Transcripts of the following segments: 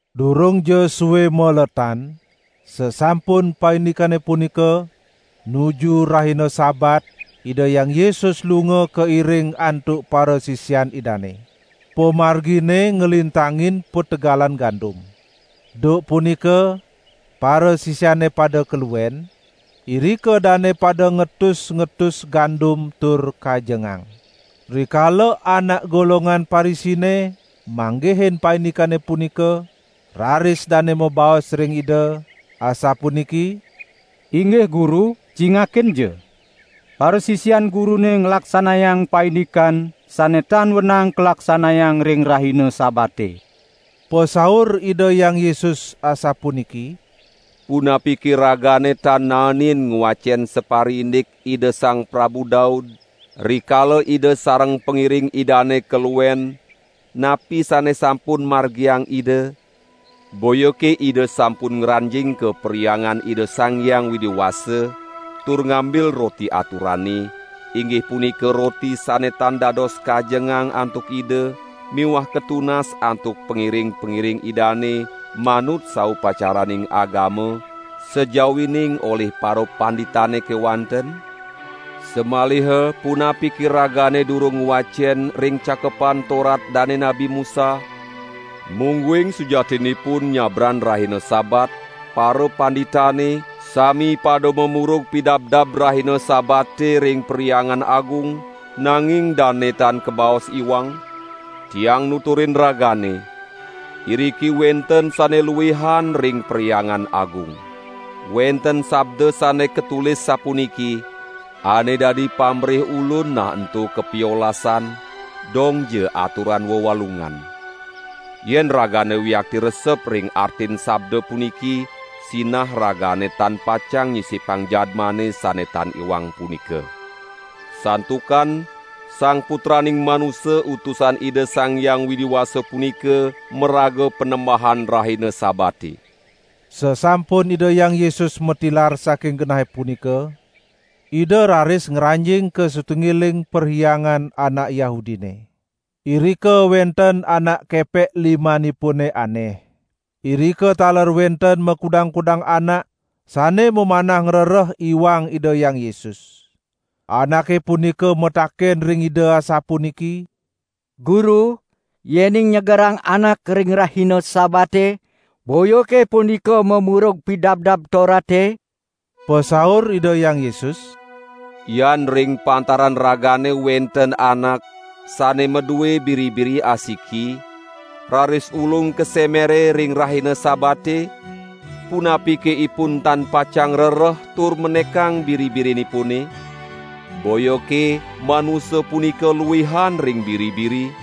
Durungja sue maletan, sasampun paindikane punika, nuju rahina Sabat, Ida Hyang Yesus lunga kairing antuk parasisian Idane. Pamargine nglintangin pategalan gandum. Duk punika parasisiane pada kaluen, irika dane pada ngetus-ngetus gandum tur kajengang. Rikala anak golongan Parisine manggihin paindikane punika, raris dane mabaos ring Ida, asapuniki: "Inggih Guru cingakinja! Parasisian Gurune nglaksanayang paindikan sane tan wenang kalaksanayang ring rahina Sabate." Pasaur Ida Hyang Yesus, asapuniki: "Punapike ragane tan naenin ngwacen sapariindik Ida Sang Prabu Daud rikala ida sareng pangiring idane kaluen, napi sane sampun margiang ida? Boyake ida sampun ngranjing ka perhyangan Ida Sang Hyang Widi Wasa tur ngambil roti aturane, inggih punika roti sane tan dados kaajengang antuk ida miwah katunas antuk pangiring-pangiring idane manut sapacaraning agama, sajawining olih parapanditane kewanten? Samaliha punapike ragane durung ngwacen ring Cakepan Torat Dane Nabi Musa, mungguing sujatinipun nyabran rahina Sabat parapanditane sami pada mamurug pidabdab rahina Sabate ring Perhyangan Agung, nanging dane tan kabaos iwang? Tiang nuturin ragane: Iriki wenten sane luihan ring Perhyangan Agung. Wenten sabda sane katulis sapuniki: 'Ane dadi pamerih Ulun nah ento kapiolasan, dongja aturan wewalungan.' Yen ragane wiakti resep ring artin sabda puniki, sinah ragane tan pacang nyisipang jadmane sane tan iwang punika. Santukan Sang Putraning Manusa Utusan Ida Sang Hyang Widi Wasa punika maraga Panembahan rahina Sabate." Sasampun Ida Hyang Yesus matilar saking genahe punika, Ida raris ngranjing ka satunggiling perhyangan anak Yahudine. Irika wenten anak kepek limanipune aneh. Irika taler wenten makudang-kudang anak sane mamanah ngrereh iwang Ida Hyang Yesus. Anake punika mataken ring Ida asapuniki: "Guru, yening nyegerang anak ring rahina Sabate, boyake punika mamurug Pidabdab Torate?" Pasaur Ida Hyang Yesus: "Yan ring pantaran ragane wenten anak sane madue biri-biri asiki, raris ulung ka semere ring rahina Sabate, punapike ipun tan pacang ngrereh tur menekang biri-birinipune? Boyake manusa punika luihan ring biri-biri?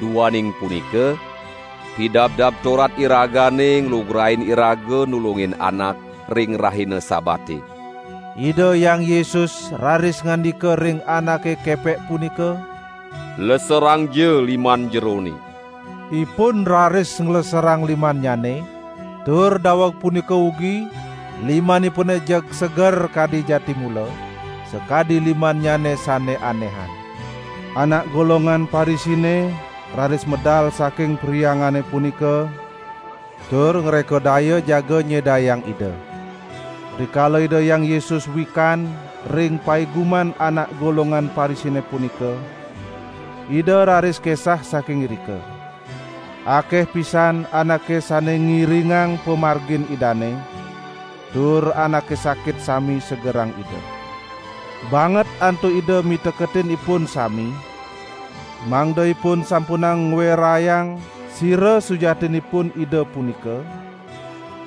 Duaning punika, Pidabdab Torat iragane nglugrain iraga nulungin anak ring rahina Sabate." Ida Hyang Yesus raris ngandika ring anake kepek punika: "Leserangja liman jerone!" Ipun raris ngleserang limannyane tur daweg punika ugi limanipune jeg seger kadi jati mula, sakadi limannyane sane anehan. Anak golongan Parisine raris medal saking perhyangane punika, tur ngreka daya jaga nyerahang Ida. Rikala Ida Hyang Yesus wikan ring paiguman anak golongan Parisine punika, Ida raris kesah saking irika. Akeh pisan anake sane ngiringang pamargin Idane, tur anake sakit sami segerang Ida. Banget antuk Ida miteketin ipun sami, mangda ipun sampunang ngwerayang sira sujatinipun Ida punika,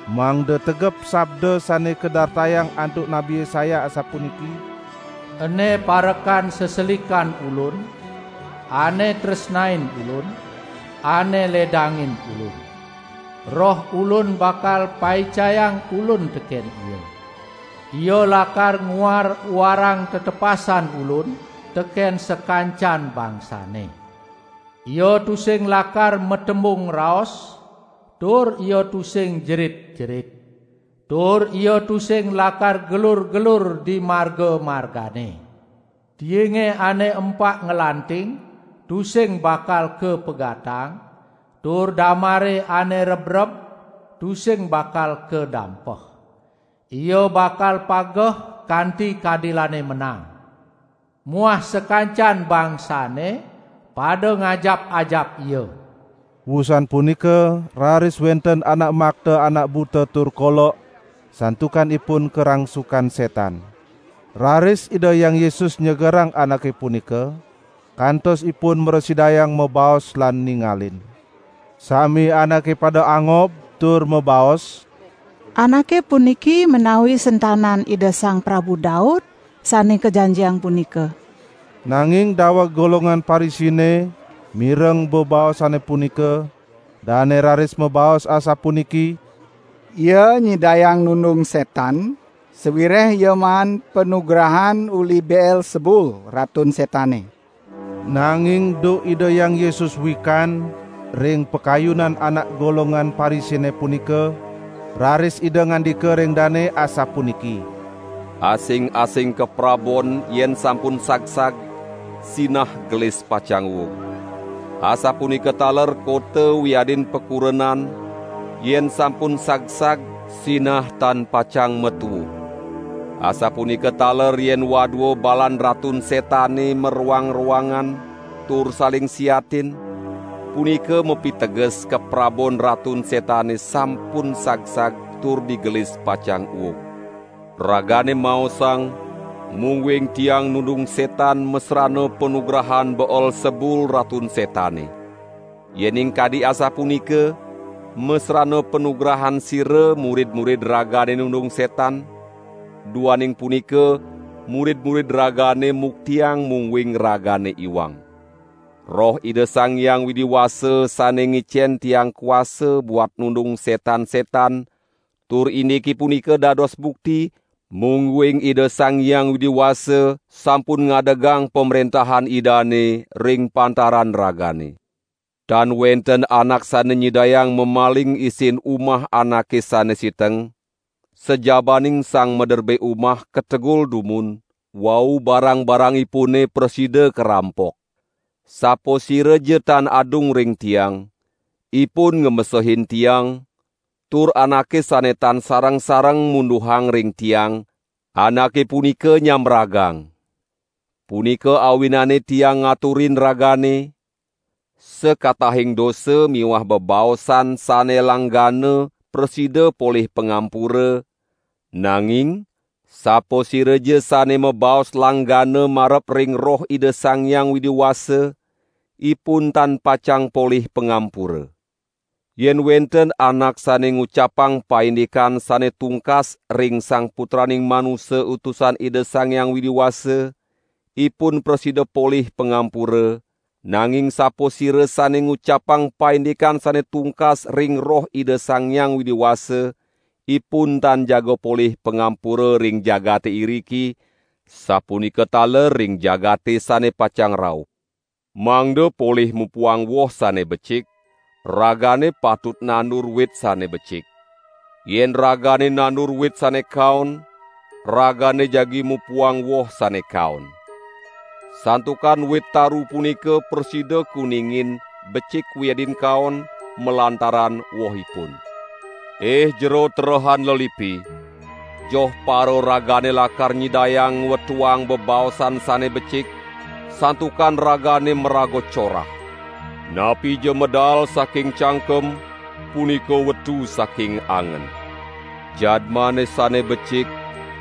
mangda tegep sabda sane kadartayang antuk Nabi Yesaya asapuniki: "Ene parekan seselikan Ulun, ane tresnain Ulun, ane ledangin Ulun. Roh Ulun bakal paicayang Ulun teken Ia. Ia lakar nguar-uarang tetepasan Ulun teken sakancan bangsane. Ia tusing lakar matembung raos, tur Ia tusing jerit-jerit. Tur ia tusing lakar gelur-gelur di marga-margane. Tiinge ane empak nglanting, tusing bakal kapegatang, tur damare ane rebreb, tusing bakal kadampeh. Ia bakal pageh kanti kadilane menang. Muah sakancan bangsane pada ngajap-ngajap Ia." Wusan punika raris wenten anak makta anak buta tur kolok, santukan ipun karangsukan setan. Raris Ida Hyang Yesus nyegerang anake punika, kantos ipun mrasidayang mabaos lan ningalin. Sami anake pada angob, tur mabaos: "Anake puniki menawi sentanan Ida Sang Prabu Daud, sane kajanjiang punika." Nanging daweg golongan Parisine mireng bebaosane punika, dane raris mabaos asapuniki: "Ia nyidayang nundung setan, sawireh Ia maan panugrahan uli Beelsebul, ratun setane." Nanging duk Ida Hyang Yesus wikan ring pakayunan anak golongan Parisine punika, raris Ida ngandika ring dane asapuniki: "Asing-asing kaprabon yen sampun sagsag, sinah gelis pacang uug. Asapunika taler kota wiadin pakurenan, yen sampun sagsag, sinah tan pacang matuuh. Asapunika taler yen wadua balan Ratun Setane maroang-roangan tur saling siatin, punika mapiteges kaprabon Ratun Setane sampun sagsag tur digelis pacang uug. Ragane maosang, mungguing Tiang nundung setan masrana panugrahan Beelsebul Ratun Setane. Yening kadi asapunika, masrana panugrahan sira murid-murid ragane nundung setan? Duaning punika murid-murid ragane muktiang mungguing ragane iwang. Roh Ida Sang Hyang Widi Wasa sane ngicen Tiang kuasa buat nundung setan-setan tur indike punika dados bukti mungguing Ida Sang Hyang Widi Wasa sampun ngadegang Pamrentahan Idane ring pantaran ragane. Tan wenten anak sane nyidayang mamaling isin umah anake sane siteng, sajabaning sang maderbe umah kategul dumun, wau barang-barangipune prasida karampok. Sapasiraja tan adung ring Tiang, ipun ngamesehin Tiang, tur anake sane tan sareng-sareng munduhang ring Tiang, anake punika nyambragang. Punika awinane Tiang ngaturin ragane: sakatahing dosa miwah bebaosan sane langgana prasida polih pangampura, nanging sapasiraja sane mabaos langgana marep ring Roh Ida Sang Hyang Widi Wasa, ipun tan pacang polih pangampura. Yen wenten anak sane ngucapang paindikan sane tungkas ring Sang Putraning Manusa Utusan Ida Sang Hyang Widi Wasa, ipun prasida polih pangampura, nanging sapasira sane ngucapang paindikan sane tungkas ring Roh Ida Sang Hyang Widi Wasa, ipun tan jaga polih pangampura ring jagate iriki, sapunika taler ring jagate sane pacang rauh." "Mangda polih mupuang woh sane becik, ragane patut nandur wit sane becik. Yen ragane nandur wit sane kaon, ragane jagi mupuang woh sane kaon. Santukan wit taru punika prasida kuningin becik wiadin kaon, malantaran wohipun. Ih jero terehan lelipi. Joh para ragane lakar nyidayang ngwetuang bebaosan sane becik, santukan ragane maraga corah. Napija medal saking cangkem, punika wetu saking angen. Jadmane sane becik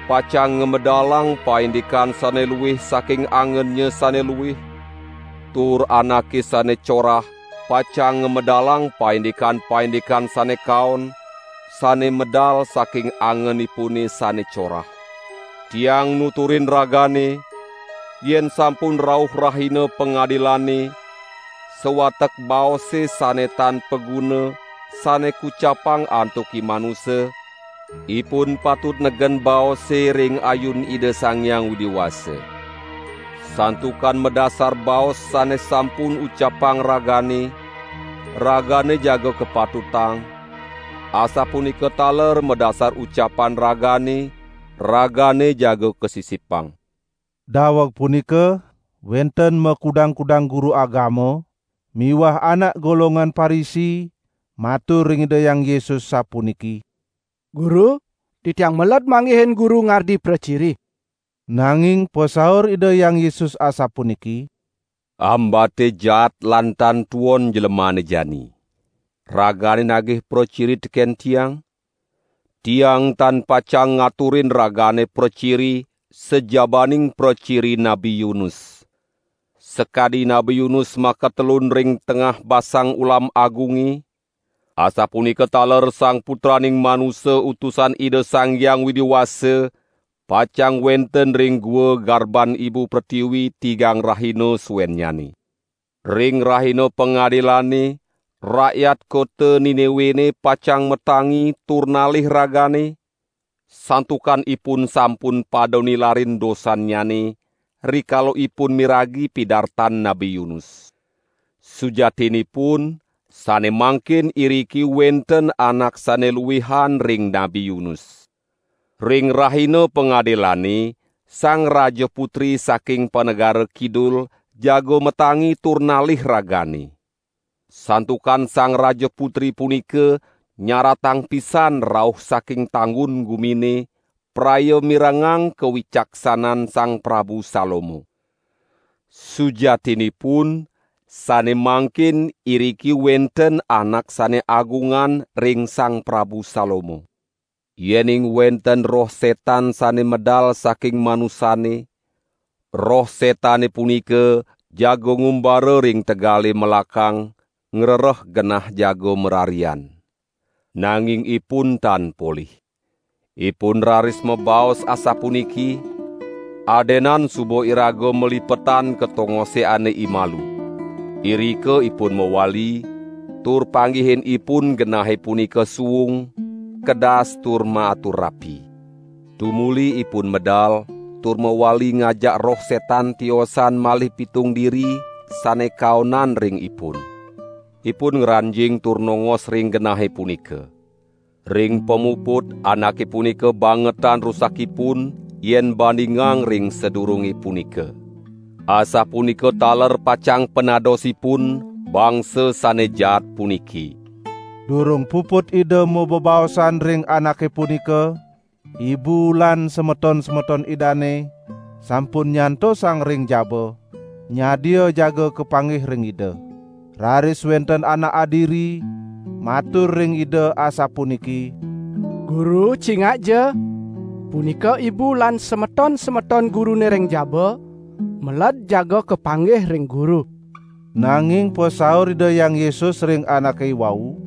pacang ngamedalang paindikan sane luih saking angennya sane luih, tur anake sane corah pacang ngamedalang paindikan-paindikan sane kaon, sane medal saking angenipune sane corah. Tiang nuturin ragane, yen sampun rauh Rahina Pangadilane, sawatek baose sane tan paguna sane kucapang antuk imanusa, ipun patut negen baose ring ayun Ida Sang Hyang Widi Wasa. Santukan madasar baos sane sampun ucapang ragane, ragane jaga kapatutang, asapunika taler madasar ucapan ragane, ragane jaga kasisipang." Daweg punika wenten makudang-kudang guru agama miwah anak golongan Parisi matur ring Ida Hyang Yesus, sapuniki: "Guru, titiang meled manggihin Guru ngardi praciri." Nanging pasaur Ida Hyang Yesus asapuniki: "Ambate jaat lan tan tuon jlemane jani. Ragane nagih praciri teken Tiang? Tiang tan pacang ngaturin ragane praciri sajabaning praciri Nabi Yunus. Sakadi Nabi Yunus makatelun ring tengah basang ulam agunge asapunika taler Sang Putraning Manusa Utusan Ida Sang Hyang Widi Wasa pacang wenten ring gua garban ibu pretiwi tigang rahina suennyane. Ring Rahina Pangadilane rakyat kota Niniwene pacang matangi tur nalih ragane, santukan ipun sampun pada nilarin dosannyane, rikala ipun miragi pidartan Nabi Yunus. Sujatinipun sane mangkin iriki wenten anak sane luihan ring Nabi Yunus! Ring Rahina Pangadilane, Sang Raja Putri saking panegara kidul jaga matangi tur nalih ragane. Santukan Sang Raja Putri punika nyaratang pisan rauh saking tanggun gumine, praya mirengang kawicaksanan Sang Prabu Salomo. Sujatinipun sane mangkin iriki wenten anak sane agungan ring Sang Prabu Salomo." "Yening wenten roh setan sane medal saking manusane, roh setane punika jaga ngumbara ring tegale melakang ngrereh genah jaga mararian. Nanging ipun tan polih. Ipun raris mabaos asapuniki: 'Adenan suba iraga malipetan ka tongose ane imalu.' Irika ipun mawali, tur panggihin ipun genahe punika suung, kedas tur maatur rapi. Tumuli ipun medal tur mawali ngajak roh setan tiosan malih pitung diri sane kaonan ring ipun. Ipun ngranjing tur nongos ring genahe punika. Ring pamuput anake punika bangetan rusakipun yen bandingang ring sadurunge punika. Asapunika taler pacang panadosipun bangsa sane jaat puniki." Durung puput Ida mabebaosan ring anake punika, ibu lan semeton-semeton Idane sampun nyantosang ring jaba, nyadia jaga kapanggih ring Ida. Raris wenten anak adiri matur ring Ida asapuniki: "Guru cingakja, punika ibu lan semeton-semeton Gurune ring jaba, meled jaga kapanggih ring Guru." Nanging pasaur Ida Hyang Yesus ring anake iwau: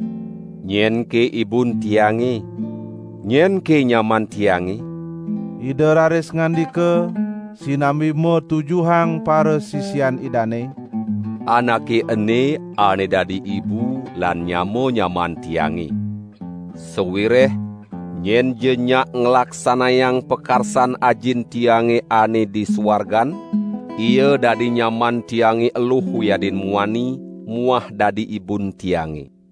"Nyenke ibun Tiange? Nyenke nyaman Tiange?" Ida raris ngandika sinambi matujuhang parasisian Idane: "Anake ene ane dadi ibu lan nyama-nyamaan Tiange! Sawireh nyenja nyak nglaksanayang pakarsan Ajin Tiange ane di suargan, ia dadi nyaman Tiange eluh wiadin muani muah dadi ibun Tiange."